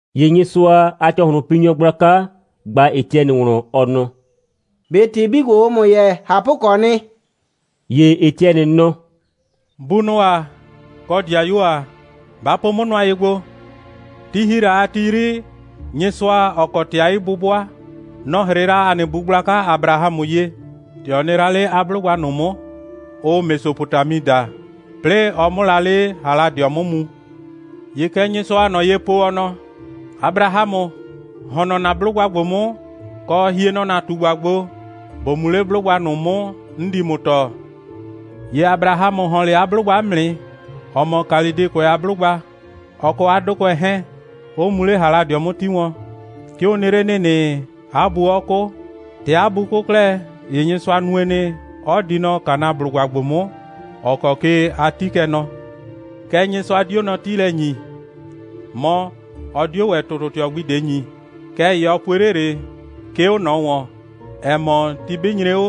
‑Ye Nyɩsʋa a ‑cɔhlʋnpinyɔ gblaka ꞊gba Etiɛnɩ wlɔn, ɔ nɔ: «꞊Be ‑tɩ 'bii ‑gbo, ʋʋ ‑mʋ yɛɛ, ꞊hapʋkɔɔ nɩ?» ‑Ye Etiɛnɩ nɔ: «Bunʋ ‑a, kɔ 'dɩayuo ‑a, ba po 'mʋ nʋa ye gbo. Ti ‑hi la a ti 'yri, Nyɩsʋa, ‑ɔ kɔ ‑tɩ a 'yi'bʋbʋa, nɔ‑ 'hrɩɩ la ‑a nɩ bu gblaka Abrahamʋ ye, ‑tɛ ɔ nɩ la 'le 'a 'blʋgba ꞊nʋ 'mʋ, ʋʋ Mesopotami daa, 'plɩɩ ɔ 'mʋ la 'le Haladɩɔ 'mʋ mu. ‑Ye kɛ Nyɩsʋaa ꞊nɔ ye po, ɔ nɔ: Abrahamʋ, ‑hɔn nɔ ‑na 'blʋgba ‑gbo 'mʋ, kɔ, hie nɔ ‑na ꞊tugba gbo, ‑bo mu 'le 'blʋgba ꞊nʋ 'mʋ, 'n di ‑mʋ tɔɔ. ‑Ye Abrahamʋ ‑hɔn 'le 'a 'blʋgba 'mʋ nɩ, ‑ɔ mɔ Kalɩdɩkʋɛ a 'blʋgba, ɔ kɔ 'a 'dʋkʋɛ 'hɛɛn, 'ɔ mu 'le Haladɩɔ 'mʋ 'ti wɔn. 'Ke ɔ nɩ 'le ‑nɩnɩ, 'a bu 'ɔ 'kʋ. ‑Tɛ 'a bu 'kʋ 'klɛɛ, ‑ye Nyɩsʋa nue nɩ, 'ɔ di nɔ Kanaablʋgba ‑gbo 'mʋ, ‑ɔ kɔ ke a 'ti kɛ nɔ. Kɛɛ, Nyɩsʋa 'dio nɔ 'tiilɛ ‑nyi, mɔ, ɔ 'dio ‑wɛ ‑tʋtʋtɩɔ gbi ꞊de ‑nyi. Kɛɛ ‑ye ɔ pue 'le ꞊le, 'ke 'o ꞊nɔ ‑wɔn, ‑ɛ mɔ, ti 'bɩ nyre 'o,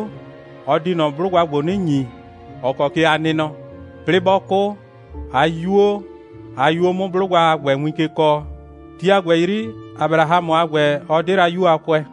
ɔ di ꞊nɔ 'blʋgba ‑gbo 'nɩ ‑nyi, ‑ɔ kɔ ke a nɩ nɔ; 'plɩɩ 'bɔ 'kʋ, 'a 'yuo a 'yuo 'mʋ 'blʋgba a ‑gbɛ win ke kɔɔ. Ti a ‑gbɛ 'yri, Abrahamʋ a ‑gbɛ, ɔ 'de la 'yu a kʋɛ.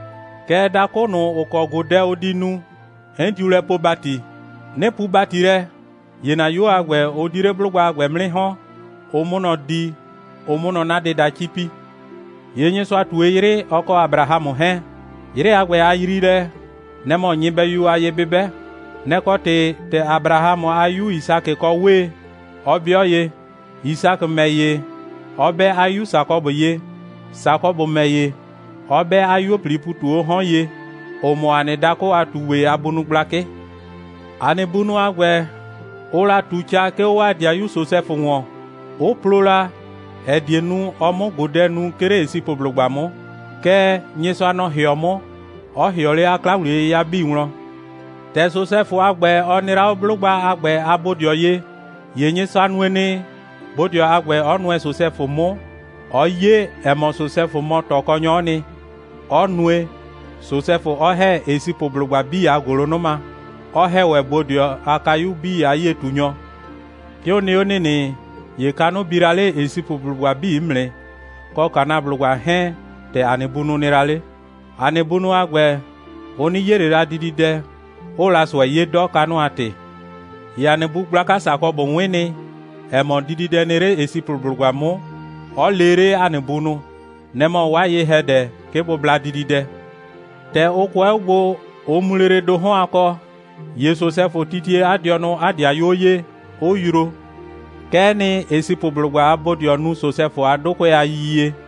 Kɛɛ, dakʋ ꞊nʋ, ‑ʋ kɔ ꞊godɛ ʋ di nu, 'n diu lɛ poo ‑bati. 'Nɩ puu ‑bati lɛ, ‑ye ‑na 'yuo a ‑gbɛ, ʋ di 'le 'blʋgba a ‑gbɛ 'mʋ 'nɩ ‑hɔn, ʋ 'mʋ nɔ di, ʋ 'mʋ nɔ 'na dɩda 'cipi. ‑Ye Nyɩsʋa ꞊tue 'yrɩ, ɔ kɔ Abrahamʋ 'hɛɛn. 'Yrɩ a ‑gbɛ, 'a yriilɛ, nɛ‑ mɔ nyɩbɛyu a ye'bɩbɛ. Nɛ‑ kɔ ‑tɩ, ‑tɛ Abrahamʋ a 'yu Yisakɩ kɔ 'wee, 'ɔ 'bɩɔ ye, Yisakɩ ‑mɛ ‑ye 'ɔ 'bɛ 'a 'yu Sakɔbʋ ye, Sakɔbʋ ‑mɛ ‑ye 'ɔ 'bɛ 'a 'yuo꞊plii ‑pu 'tu 'o 'hɔn ye, ‑ʋ mɔ ‑a nɩ dakʋ a ꞊tugbɩ a bunʋ gblakɩ. ‑A nɩ bunʋ a ‑gbɛ, ʋʋ la ꞊tu ca, 'ke 'o 'waa ‑dɩayu Sosɛfʋ ‑wɔn, 'ʋ plo la, ‑ɛ die nu, ɔ 'mʋ ꞊godɛ nu, 'ke 'le Esipʋblʋgba 'mʋ. Kɛɛ, Nyɩsʋa, nɔ‑ ‑hɩɔ 'mʋ, 'ɔ ‑hɩɔ 'le 'a 'kla‑wliye'yɩya 'bii wlɔn. ‑Tɛ Sosɛfʋ a ‑gbɛ, ɔ nɩ la 'o 'blʋgba a ‑gbɛ a bodɩɔ ye, ‑ye Nyɩsʋa nue nɩ, bodɩɔ a ‑gbɛ 'ɔ nʋɛ Sosɛfʋ 'mʋ, 'ɔ 'ye, ‑ɛ mɔ, Sosɛfʋ mɔ ꞊tɔkɔnyɔ'ɔ nɩ, 'ɔ nue, Sosɛfʋ 'ɔ ‑hɛ Esipʋblʋgba 'bii a ‑gʋlʋnʋma, 'ɔ ‑hɛ ‑wɛ bodɩɔ a kayuo 'bii a 'yie꞊tunyɔ. 'Ke ʋ nɩ 'o ‑nɩnɩ, ‑ye kanʋ bi la 'le Esipʋblʋgba 'bii 'mʋ nɩ, kɔ Kanaablʋgba 'hɛɛn, ‑tɛ ‑a nɩ bunʋ nɩ la 'le. ‑A nɩ bunʋ a ‑gbɛ, ʋ 'nɩ 'ye ꞊le la dididɛ, 'ʋʋ la ꞊sʋɛ 'ye 'dɔ, kanʋ a ‑tɩ. ‑Ye ‑a nɩ bu gblaka Sakɔbʋ 'wɩn nɩ, ‑ɛ mɔ, dididɛ nɩ 'le Esipʋblʋgba 'mʋ, 'ɔ lee 'le ‑a nɩ bunʋ. Nɛ‑ mɔ 'waa ye‑hɛdɛ, 'ke bʋ bla dididɛ. ‑Tɛ ʋ kʋɛ 'o gbo, ʋ mu 'le lele ‑do 'hɔn a kɔ, ‑ye Sosɛfʋ titie 'a dɩɔnʋ 'a 'dɩayuo ye, 'ʋ yroo. Kɛ'ɛ nɩ, Esipʋblʋgba a bodɩɔ nu Sosɛfʋ a 'dʋkʋɛ a yiyie.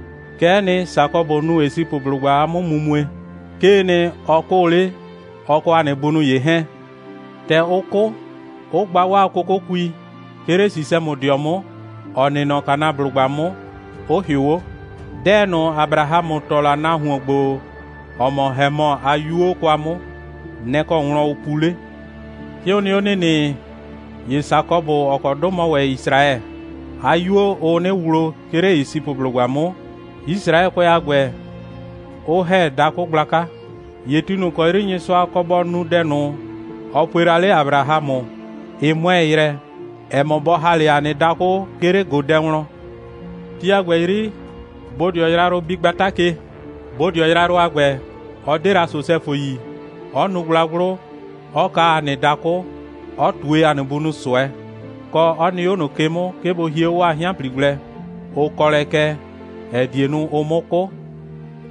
Kɛ'ɛ nɩ, Sakɔbʋ nu Esipʋblʋgba a 'mʋmumue. 'Kee nɩ, ɔ 'kʋʋ 'le, ɔ kɔ ‑a nɩ bunʋ ‑ye 'hɛɛn. ‑Tɛ ʋ 'kʋ, 'ʋ gba 'waa 'kʋkʋkui, 'ke 'le Sisɛmʋdɩɔ 'mʋ, ‑ɔ nɩ nɔ Kanaablʋgba 'mʋ, 'ʋ ‑hɩʋ 'o. 'Dɛɛ ꞊nʋ, Abrahamʋ ‑tɔ la nahuon ‑gbo, ‑ɔ mɔ Hemɔ a 'yuo kwa 'mʋ, nɛ‑ kɔ wlɔn ʋ pu 'le. 'Ke ʋ nɩ 'o ‑nɩnɩ, ‑ye Sakɔbʋ, ‑ɔ kɔ 'dʋ mɔ ‑wɛ Yisraɛ, 'a 'yuo, ʋʋ 'nɩ wlo, 'ke 'le Esipʋblʋgba 'mʋ, Yisraɛkʋɛ a ‑gbɛ 'ʋ ‑hɛ dakʋ gblaka. ‑Ye ti ꞊nʋ ‑kɔ 'yri Nyɩsʋa kɔ bɔ nu dɛ ꞊nʋ, ɔ pue la 'le Abrahamʋ, ɩ 'mʋɛɛ yrɛ, ‑ɛ mɔ, bɔ ‑ha 'le ‑a nɩ dakʋ, 'ke 'le ꞊godɛ wlɔn. Ti a ‑gbɛ 'yri, bodɩɔ yrayrʋ bi gbata ke. Bodɩɔ yrayrʋ a ‑gbɛ, ɔ 'de la Sosɛfʋ yi, 'ɔ nu gblagblʋ, 'ɔ kaa ‑a nɩ dakʋ, 'ɔ ꞊tue ‑a nɩ bunʋ ꞊sʋɛ, kɔ, 'ɔ nɩ 'o ꞊nʋ ke 'mʋ, 'ke bʋ hie 'o 'waa 'hɩanpli gblɛ, ʋ kɔ lɛ kɛ, ‑ɛ die nu, ʋ 'mʋ 'kʋ.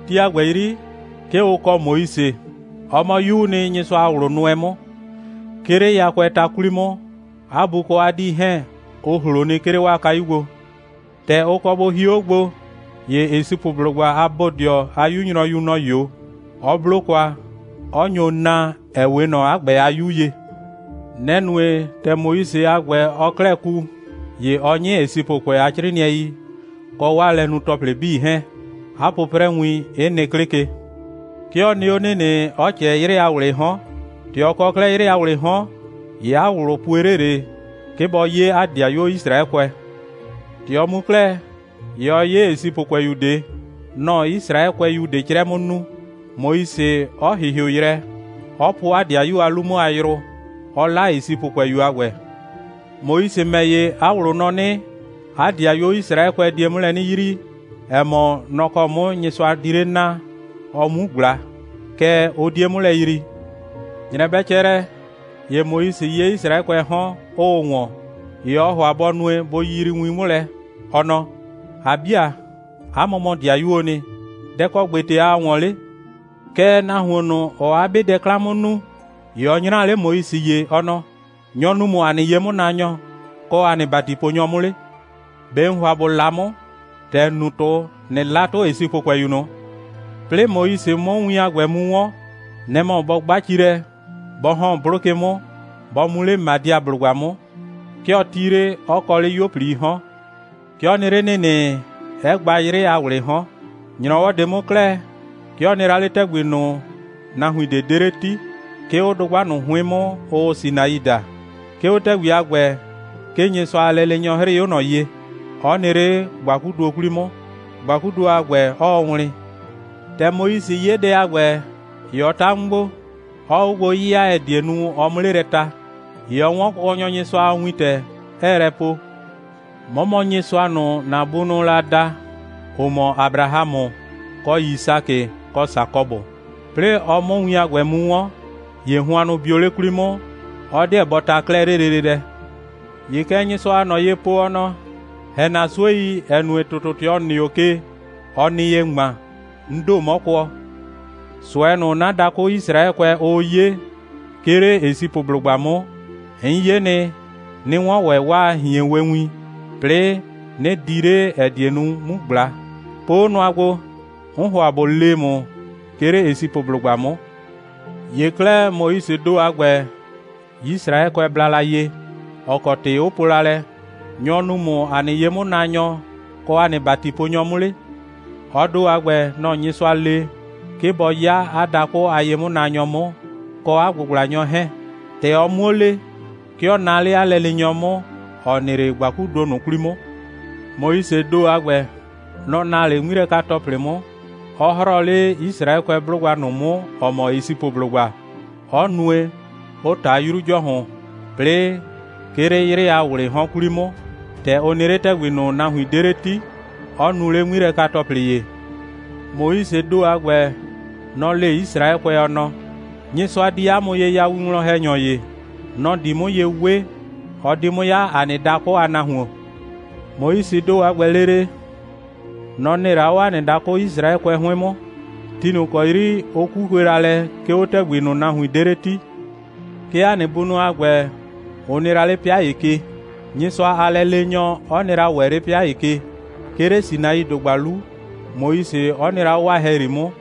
Ti a ‑gbɛ 'yri, 'ke ʋ kɔ Moise. Ɔ mɔ 'yuu nɩ, Nyɩsʋa a ꞊wlʋ nʋɛ 'mʋ. 'Ke 'le yakʋɛɛ ta 'kwli 'mʋ, 'a bu kɔ 'a 'dii 'hɛɛn, ʋ ‑hlo nɩ, 'ke 'le 'waa kayu gbo. ‑Tɛ ʋ kɔ bʋ hio 'o gbo, ‑ye Esipʋblʋgba a bodɩɔ a 'yu nyrɔyu, nɔ‑ 'yo, 'ɔ 'blo kwa, 'ɔ nyo naa, ‑ɛ 'we ꞊nɔ 'a ‑gbɛ a 'yu ye. Nɛ‑ nue, ‑tɛ Moise a ‑gbɛ, ɔɔ 'klɛɛ ku, ‑ye ɔɔ 'nyɩ Esipʋkʋɛ a 'crɩɩnɩɛi kɔ 'waa lɛnu‑tɔplɩ 'bii 'hɛɛn, 'a 'pʋprɛwin 'ɩ nɩ 'klɩ ke. 'Ke ɔ nɩ 'o ‑nɩnɩ, 'ɔ ꞊cɛɛ 'yrɩ a ‑wlɩɩ 'hɔn. ‑Tɛ ɔ kɔ 'klɛɛ 'yrɩ a ‑wlɩɩ 'hɔn, ‑ye 'a ꞊wlʋ pue 'le ꞊le, 'ke bɔ 'ye 'a 'dɩayuo Yisraɛkʋɛ. ‑Tɛ ɔ mu 'klɛɛ, ‑ye ɔ 'ye Esipʋkʋɛyu ꞊de. Nɔ‑ɔ Yisraɛkʋɛyu ꞊de 'crɛ 'mʋ nu, Moise 'ɔ ‑hɩhɩʋ yrɛ, 'ɔ po 'a 'dɩayu a 'lu 'mʋ a yrʋ, 'ɔ 'la Esipʋkʋɛyu a ‑gbɛ. Moise ‑mɛ ‑ye, 'a ꞊wlʋ nɔ 'nɩ, 'a 'dɩayuo Yisraɛkʋɛ die 'mʋ lɛ 'nɩ yrii, ‑ɛ mɔ, nɔ‑ kɔ 'mʋ Nyɩsʋa di 'le naa, ɔ 'mu ꞊gbla. Kɛɛ, ʋ 'die 'mʋ lɛ yrii. ‑Nyrɛ bɛ cɛ lɛ, ‑ye Moise 'ye Yisraɛkʋɛɛ 'hɔn, 'ʋʋ ‑wɔn. ‑Ye ɔɔ ‑hʋa bɔ nue, bʋ yiyrii win 'mʋ lɛ, ɔ nɔ: ‑A 'bi ‑a, 'a mʋ mɔ ‑dɩayuoo nɩ. Dɛ‑ kɔ ‑gbete aa ‑wɔn 'le? Kɛɛ, nahuon ꞊nʋ, ‑ɔɔ 'a 'be dɛ 'klan 'mʋ nu, ‑ye ɔ 'nyraa 'le Moise ye, ɔ nɔ: Nyɔ‑ nuu ‑mʋ ‑a nɩ ye'mʋnaanyɔ kɔ ‑a nɩ ‑batiponyɔ 'mʋ 'le? ꞊Be ‑n ‑hʋa ‑bo 'la 'mʋ, ‑tɛ ‑n nu 'tʋ, ꞊nɩ 'la 'tʋ Esipʋkʋɛyu ꞊nʋ? 'Plɩɩ Moise 'mʋ win a ‑gbɛ mu 'wɔn, nɛ‑ mɔ bɔ 'gba ci lɛ, bɔ ‑hɔn 'blʋ ke 'mʋ, bɔ mu 'le Madiablʋgba 'mʋ. 'Ke ɔ 'ti 'le, 'ɔ kɔ 'le 'yuo꞊plii 'hɔn. 'Ke ɔ nɩ 'le ‑nɩnɩ, 'ɛ gba 'yrɩ a ‑wlɩɩ 'hɔn. ‑Nyrɔwɔ ꞊de 'mʋ 'klɛɛ, 'ke ɔ nɩ la 'le ‑tɛgbi ꞊nʋ, nahuin ꞊de 'de 'le 'ti, 'ke 'o dʋgba ꞊nʋ 'hʋɩn 'mʋ, ʋʋ Sinai daa. 'Ke 'o ‑tɛgbi a ‑gbɛ, 'ke Nyɩsʋa a lɛleenyɔ 'hrɩɩ 'o ꞊nɔ ye, 'ɔ nɩ 'le ‑gbakuduo 'kwli 'mʋ, ‑gbakuduo a ‑gbɛ 'ɔɔ wlɩn. ‑Tɛ Moise 'ye dɛ a ‑gbɛ, ‑ye ɔ ta 'mʋ gbo, 'ɔɔ 'o gbo 'yɩya, ‑ɛ die nu, ɔ 'mʋ 'le lɛ ta. ‑Ye ɔ 'wɔn Kʋkɔnyɔ Nyɩsʋa a wintɛ, 'ɛɛ lɛ po: 'Mɔ mɔ Nyɩsʋa ꞊nʋ, ‑na bunʋʋ la da, ‑ʋ mɔ Abrahamʋ, kɔ Yisakɩ, kɔ Sakɔbʋ. 'Plɩɩ ɔ 'mʋ win a ‑gbɛ mu 'wɔn, ‑ye hʋannʋ bio 'le 'kwli 'mʋ, 'ɔ 'deɛ bɔ ta 'klɛɛ 'le lele lɛ. ‑Ye kɛ Nyɩsʋaa ꞊nɔ ye po, ɔ nɔ: ‑Hɛ ‑na 'suei, ‑ɛ nue, ‑tʋtʋtɩɔ, ‑n nɩ 'o ke, ɔ nɩ ye ‑ŋma, 'n ‑do, 'mɔ kʋɔ. ꞊Sʋɛ ꞊nʋ, 'na dakʋ Yisraɛkʋɛ, ʋʋ 'ye, 'ke 'le Esipʋblʋgba 'mʋ, 'n ye nɩ, 'nɩ 'wɔn ‑wɛ 'waa ꞊hienwewin, 'plɩɩ 'nɩ di 'le, ‑ɛ die nu, 'mu ꞊gbla. Po 'o nʋa gbo. 'N ‑hʋa ꞊bo lee ‑mʋ, 'ke 'le Esipʋblʋgba 'mʋ. ‑Ye 'klɛɛ, Moisee ‑do a ‑gbɛ, Yisraɛkʋɛ bla la ye, ‑ɔ kɔ ‑tɩ 'ʋ po la lɛ: Nyɔ‑ nuu ‑mʋ ‑a nɩ ye'mʋnaanyɔ kɔ ‑a nɩ ‑batiponyɔ 'mʋ 'le? ɔ ‑do a ‑gbɛ, nɔ‑ Nyɩsʋa le, 'ke bɔ 'ya 'a dakʋ a ye'mʋnaanyɔ 'mʋ, kɔ 'a ꞊gbʋgblanyɔ 'hɛɛn. ‑Tɛ ɔ 'muo le, 'ke ɔ naa 'le 'a lɛleenyɔ 'mʋ, ‑ɔ nɩ 'le ‑gbakuduo ꞊nʋ 'kwli 'mʋ. Moisee ‑do a ‑gbɛ, nɔ‑ naa 'le 'ŋmilɛka‑tɔplɩ 'mʋ, 'ɔ 'hrɔɔ 'le Yisraɛkʋɛ 'blʋgba ꞊nʋ 'mʋ, ‑ɔ mɔ Esipʋblʋgba, 'ɔ nue, 'ʋ ꞊ta 'Yru ‑Jɔhʋn, 'plɩɩ, 'ke 'le 'yrɩ a ‑wlɩɩ 'hɔn 'kwli 'mʋ, ‑tɛ ʋ nɩ 'le ‑tɛgbi ꞊nʋ, nahuin 'de 'le 'ti, 'ɔ nu lele 'ŋmilɛka‑tɔplɩ ‑ye. Moisee ‑do a ‑gbɛ, nɔ‑ le Yisraɛkʋɛ, ɔ nɔ: Nyɩsʋa di 'a mʋ ye ya winwlɔn‑hɛnyɔ ‑ye. Nɔ‑ di 'mʋ ye 'we. Ɔ di 'mʋ 'ya ‑a nɩ dakʋ a nahuon. Moisee ‑do a ‑gbɛ lele, nɔ‑ nɩ la 'o ‑a nɩ dakʋ Yisraɛkʋɛ 'hʋɩn 'mʋ, ti ꞊nʋ ‑kɔ 'yri ʋ 'kukue la lɛ, 'ke 'o ‑tɛgbi ꞊nʋ, nahuin 'de 'le 'ti. 'Ke ‑a nɩ bunʋ a ‑gbɛ, ʋ nɩ la 'le 'pɩa ‑ye ke, Nyɩsʋa a lɛleenyɔ 'ɔ nɩ la ‑wɛ 'le 'pɩa ‑ye ke, 'ke 'le Sinaidʋgba 'lu, Moise 'ɔ nɩ la 'o 'waa ‑hɛyri 'mʋ,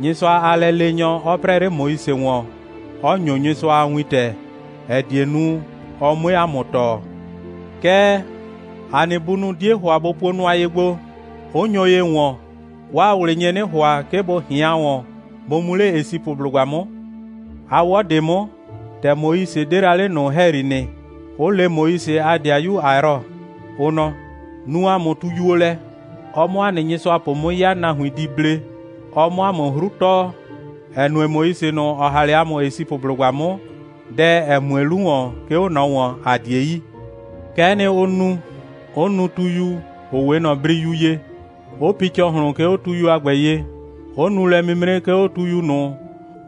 Nyɩsʋa a lɛleenyɔ 'ɔ 'prɛɛ 'le Moise ‑wɔn, 'ɔ ‑nyo Nyɩsʋa a wintɛ, ‑ɛ die nu, ɔ 'mue ‑a mʋ tɔɔ. Kɛɛ, ‑a nɩ bunʋ 'die ‑hʋa bʋ puo nʋa ye gbo, 'ʋ nyo ye ‑wɔn. 'Waa ꞊wlɩ nye 'nɩ ‑hʋa, 'ke bʋ ꞊hɩan ‑wɔn, bʋ mu 'le Esipʋblʋgba 'mʋ. A 'wɔ ꞊de 'mʋ, ‑tɛ Moise 'de la 'le ꞊nʋ ‑hɛyri nɩ, 'ʋ le Moise a 'dɩayu Ayrɔ, ʋ nɔ: Nuu ‑a mʋ tuyuo lɛ, ɔ 'mʋ ‑a nɩ nyɩsʋapʋ 'mʋ 'ya, nahuin di 'ble, ɔ 'mʋ ‑a mʋ 'hru tɔɔ, ‑ɛ nue, Moise ꞊nʋ, ‑ɔ ‑ha 'le ‑a mʋ Esipʋblʋgba 'mʋ, dɛ, ‑ɛ mue 'lu ‑wɔn, 'ke 'o ꞊nɔ ‑wɔn, ‑a 'die yi. Kɛ'ɛ nɩ, ʋ nu, 'ʋ nu tuyu, ‑ʋ 'we ꞊nɔ briyu ye, 'ʋ pi ‑cɔhlʋn, 'ke 'o tuyu a ‑gbɛ ye, 'ʋ nu lɛ'mimre, 'ke 'o tuyu ꞊nʋ,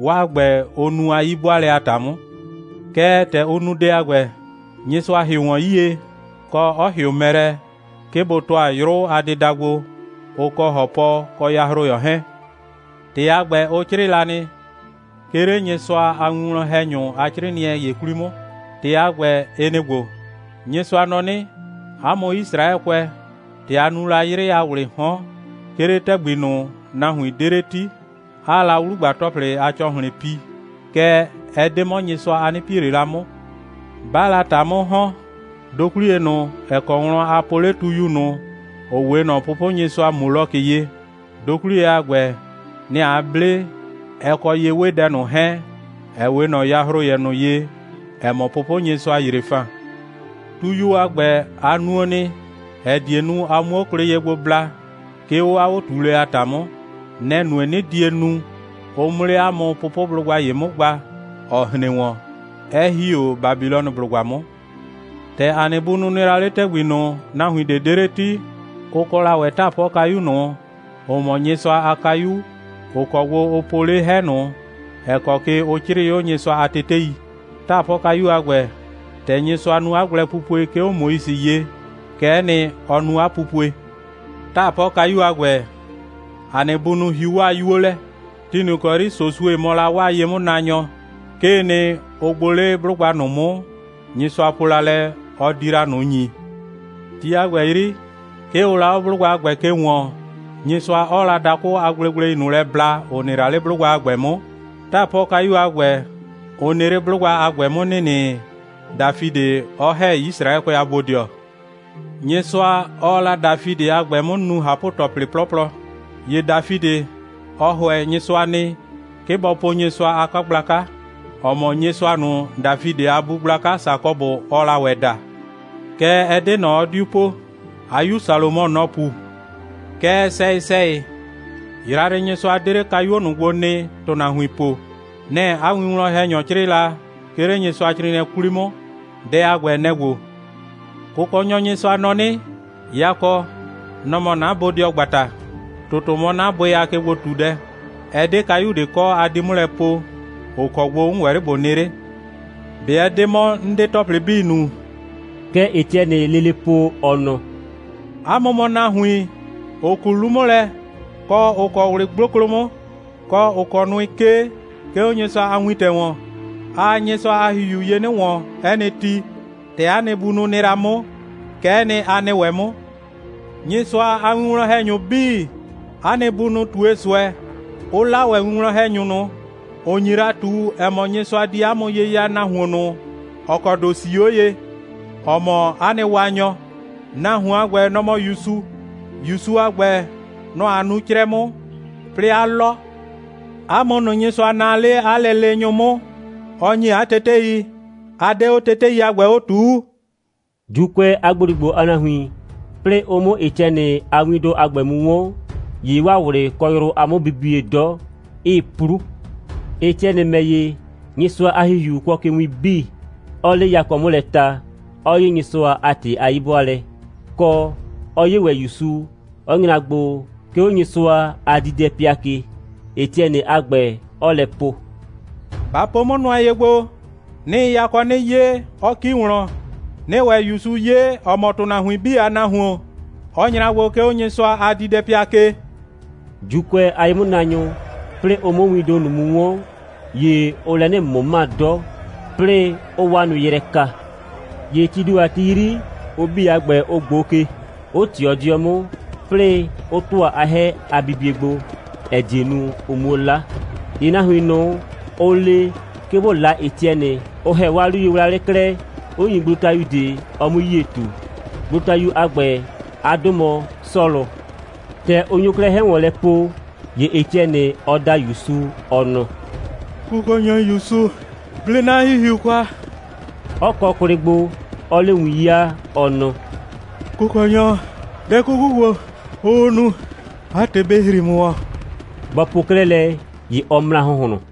'waa ‑gbɛ, ʋ nu a 'yi'bʋaalɛ a ‑ta 'mʋ. Kɛɛ, ‑tɛ ʋ nu dɛ a ‑gbɛ, Nyɩsʋa ‑hɩʋ ‑wɔn 'yie, kɔ, 'ɔ ‑hɩʋ mɛ lɛ, 'ke bʋ ‑tʋa 'yrʋ a dɩda gbo, ʋ kɔ ‑hɔpɔ kɔ yahroyɔ 'hɛɛn. ‑Tɩ a ‑gbɛ, ʋ 'crɩɩ la nɩ, 'ke 'le Nyɩsʋa a winwlɔn‑hɛnyʋ a 'crɩɩnɩɛ ‑ye 'kwli 'mʋ. ‑Tɩ a ‑gbɛ, ɩ nɩ‑ ‑gbo: Nyɩsʋa nɔ 'nɩ: 'A mʋ Yisraɛkʋɛ, ‑tɛ a nu la 'yrɩ a ‑wlɩɩ 'hɔn, 'ke 'le ‑tɛgbi ꞊nʋ, nahuin ꞊de 'de 'le 'ti, 'aa la 'wlugba‑tɔplɩ a ‑cɔhlɩn pi, kɛɛ, ɛ 'de 'mɔ Nyɩsʋa, a 'nɩ pie ꞊le la 'mʋ. 'Baa la ‑ta 'mʋ ‑hɔn, dokwliye ꞊nʋ, ‑ɛ kɔ wlɔn a po 'le tuyu ꞊nʋ, ‑ʋ 'we ꞊nɔ pʋpʋnyɩsʋa Molokɩ ye, dokwliye a ‑gbɛ, nɛ‑ a 'ble, ɛ kɔ ye'wedɛ ꞊nʋ 'hɛɛn, ‑ɛ 'we ꞊nɔ yahroyɛ ꞊nʋ ye, ‑ɛ mɔ pʋpʋnyɩsʋa Yrefan. Tuyuo a ‑gbɛ, a nuo nɩ, ‑ɛ die nu, a 'muo kwlɩ ye gblɛ bla, 'ke 'o 'a 'o꞊tuulɛ a ‑ta 'mʋ. Nɛ‑ nue, 'nɩ die nu, ʋ 'mʋ 'le 'a mʋ pʋpʋblʋgba ‑ye 'mʋ gba, ‑ɔ hren ‑wɔn, 'ɛ ‑hi 'o Babilɔnɩblʋgba 'mʋ. ‑Tɛ ‑a nɩ bunʋ nɩ la 'le ‑tɛgbi ꞊nʋ, nahuin ꞊de 'de 'le 'ti, ʋ kɔ la ‑wɛ 'taapɔkayu ꞊nʋ, ‑ʋ mɔ Nyɩsʋa a kayu, ‑ʋ kɔ gbo ʋ po 'le 'hɛ ꞊nʋ, ‑ɛ kɔ ke ʋ 'crɩɩ 'o Nyɩsʋa a tetei. 'Taapɔkayu a ‑gbɛ, ‑tɛ Nyɩsʋa nu 'a gblɛpupue, 'ke 'o Moise ye, kɛ'ɛ nɩ, ʋ nu 'a pupue. 'Taapɔkayu a ‑gbɛ, ‑a nɩ bunʋ hiu 'waa 'yuo lɛ. Ti ꞊nʋ ‑kɔ 'yri Sosue mɔ la 'waa ye'mʋnaanyɔ, 'kee nɩ, ʋ gbʋ 'le 'blʋgba ꞊nʋ 'mʋ, Nyɩsʋa po la lɛ, ɔ di la ꞊nʋ ‑nyi. Ti a ‑gbɛ 'yri, 'ke ʋʋ la 'o 'blʋgba a ‑gbɛ ke ‑wɔɔn, Nyɩsʋa 'ɔɔ la dakʋ a gblegblei ꞊nʋ lɛ bla, ‑ʋ nɩ la 'le 'blʋgba a ‑gbɛ 'mʋ. 'Taapɔkayu a ‑gbɛ, ʋ nɩ 'le 'blʋgba a ‑gbɛ 'mʋ ‑nɩnɩ, Dafidɩ 'ɔ ‑hɛ Yisraɛkʋɛ a bodɩɔ. Nyɩsʋa, ɔɔ la Dafidɩ a ‑gbɛ 'mʋ nu ꞊hapʋ‑tɔplɩ 'plɔplɔ. ‑Ye Dafidɩ, ɔ ‑hʋɛ Nyɩsʋa nɩ, 'ke bɔ po Nyɩsʋa a 'kagblaka, ‑ɔ mɔ Nyɩsʋa ꞊nʋ, Dafidɩ a bu gblaka Sakɔbʋ, ɔɔ la ‑wɛ da. Kɛɛ, ɛ 'de ꞊nɔ, ɔ 'diu po. 'A 'yu Salomɔ, nɔ‑ pu. Kɛɛ, sɛyɩ‑sɛyɩ, Yrayrɩnyɩsʋa 'de 'le kayuo ꞊nʋ gbo nɩ, ‑tʋnahuin po. Nɛ‑ 'a winwlɔn‑hɛnyɔ 'crɩɩ la, 'ke 'le Nyɩsʋacrɩɩnɩɛ 'kwli 'mʋ. Dɛ a ‑gbɛ, nɛ‑ ‑gbo: Kʋkɔnyɔ Nyɩsʋa nɔ 'nɩ: Yakɔ, nɔ‑ mɔ 'na bodɩɔgbata, ‑tʋtʋ mɔ 'na bʋɩ a kegbo꞊tudɛ. Ɛ 'de kayu ꞊de kɔ, a di 'mʋ lɛ poo, ‑ʋ kɔ gbo 'n ‑wɛ 'le ꞊bo nɩ 'le. ꞊Be ɛ 'de 'mɔ, 'n 'de ‑tɔplɩ 'bii nu?» Kɛ Etiɛnɩɩ lele po, ɔ nɔ: «'A mʋ mɔ nahuin, ‑ʋ ku 'lu 'mʋ lɛ, kɔ, ‑ʋ kɔ ꞊wlɩ 'gboklo 'mʋ, kɔ, ‑ʋ kɔ nʋɩ 'kee, 'ke 'o Nyɩsʋa a wintɛ ‑wɔn. Aa Nyɩsʋa a ‑Hihiu ye 'nɩ ‑wɔn 'ɛ nɩ ti. ‑Tɛ 'a nɩ bunʋ nɩ la 'mʋ, kɛ'ɛ nɩ, a nɩ ‑wɛ 'mʋ. Nyɩsʋa a winwlɔn‑hɛnyʋ 'bii, 'a nɩ bunʋ ꞊tue ꞊nʋ ꞊sʋɛ, 'ʋ 'la ‑wɛ winwlɔn‑hɛnyʋ ꞊nʋ, ‑ʋ nyi la ꞊tu, ‑ɛ mɔ, Nyɩsʋa di 'a mʋ ye ya nahuon ꞊nʋ, ‑ɔ kɔ ‑do 'sii 'o ye, ‑ɔ mɔ 'a nɩ Waanyɔ. Nahuon a ‑gbɛ, nɔ‑ mɔ ‑Yusu. ‑Yusu a ‑gbɛ, nɔ‑ a nu 'crɛ 'mʋ, 'plɩɩ 'a 'lɔ. 'A mʋ ꞊nʋ, Nyɩsʋa naa 'le 'a lɛleenyʋ 'mʋ, ɔ ‑nyi 'a tetei, a 'de 'o tetei a ‑gbɛ 'o ꞊tuu.» ‑Juukʋɛ a ‑gboligbo a nahuin, 'plɩɩ ʋ 'mʋ Etiɛnɩ a windʋ a ‑gbɛ mu 'wɔn, ‑ye 'waa ꞊wlɩ kɔ yrʋ a 'mʋbibie 'dɔ, 'ɩɩ 'plu. Etiɛnɩ ‑mɛ ‑ye, Nyɩsʋa a ‑Hihiu kʋɔ ke win 'bii, 'ɔɔ 'le yakɔ 'mʋ lɛ ta, 'ɔ 'ye Nyɩsʋa a ‑tɩ a 'yi'bʋaalɛ, kɔ, 'ɔ 'ye ‑wɛ ‑Yusu, 'ɔ nyra gbo, 'ke 'o Nyɩsʋa a diidɛpɩa ke, Etiɛnɩ a ‑gbɛ, 'ɔɔ lɛ po: «Ba po 'mʋ nʋa ye gbo, 'nɩɩ yakɔ 'nɩ 'ye, 'ɔ ‑ki wlɔn, 'nɩɩ ‑wɛ ‑Yusu 'ye, ‑ɔ mɔ ‑tʋnahuin 'bii a Nahuon, 'ɔ nyra gbo, 'ke 'o Nyɩsʋa a diidɛpɩa ke.» ‑Juukʋɛ a ye'mʋnaanyʋ, 'plɩɩ ʋ 'mʋ windʋ ꞊nʋ mu 'wɔn, ‑ye ʋʋ lɛ 'nɩ ꞊mʋma 'dɔ, 'plɩɩ 'ʋʋ 'waa nʋɩ yrɛ ka. ‑Ye tii ‑do a ti 'yri, ʋ 'bii a ‑gbɛ, ʋ ꞊gboo ke, 'ʋ ꞊tɩɔ 'dɩɔ 'mʋ, 'plɩɩ 'ʋ ‑tʋa 'a 'hɛ a bibie gbo, ‑ɛ die nu, ʋ 'muo 'la. ‑Ye nahuin ꞊nʋ, ʋ le, 'ke bʋ 'la Etiɛnɩ, ʋ ‑hɛ 'waa 'luyewlawlɩ klɛ, 'ʋ ‑nyi gblotayu ꞊de, ɔ 'mui 'yie ꞊tu. Gblotayu a ‑gbɛ, 'a 'dʋ mɔ Sɔlʋ. ‑Tɛ ʋ nyo 'klɛɛ 'hɛ ‑wɔn lɛ po, ‑ye Etiɛnɩ, ɔ da ‑Yusu, ɔ nɔ: «Kʋkɔnyɔ ‑Yusu, 'ble 'na ‑hihiu kwa,» 'ɔ kɔ kwlɩ gbo, 'ɔɔ 'le win 'yaa, ɔ nɔ: «Kʋkɔnyɔ, dɛ 'kuku ‑gbo, ʋʋ nu, 'a ‑tɩ bɩ ‑hri ‑mʋ ‑wɔn!» Bɔ po 'klɛɛ lɛ, ‑ye ɔ mra ‑hʋnhlʋn.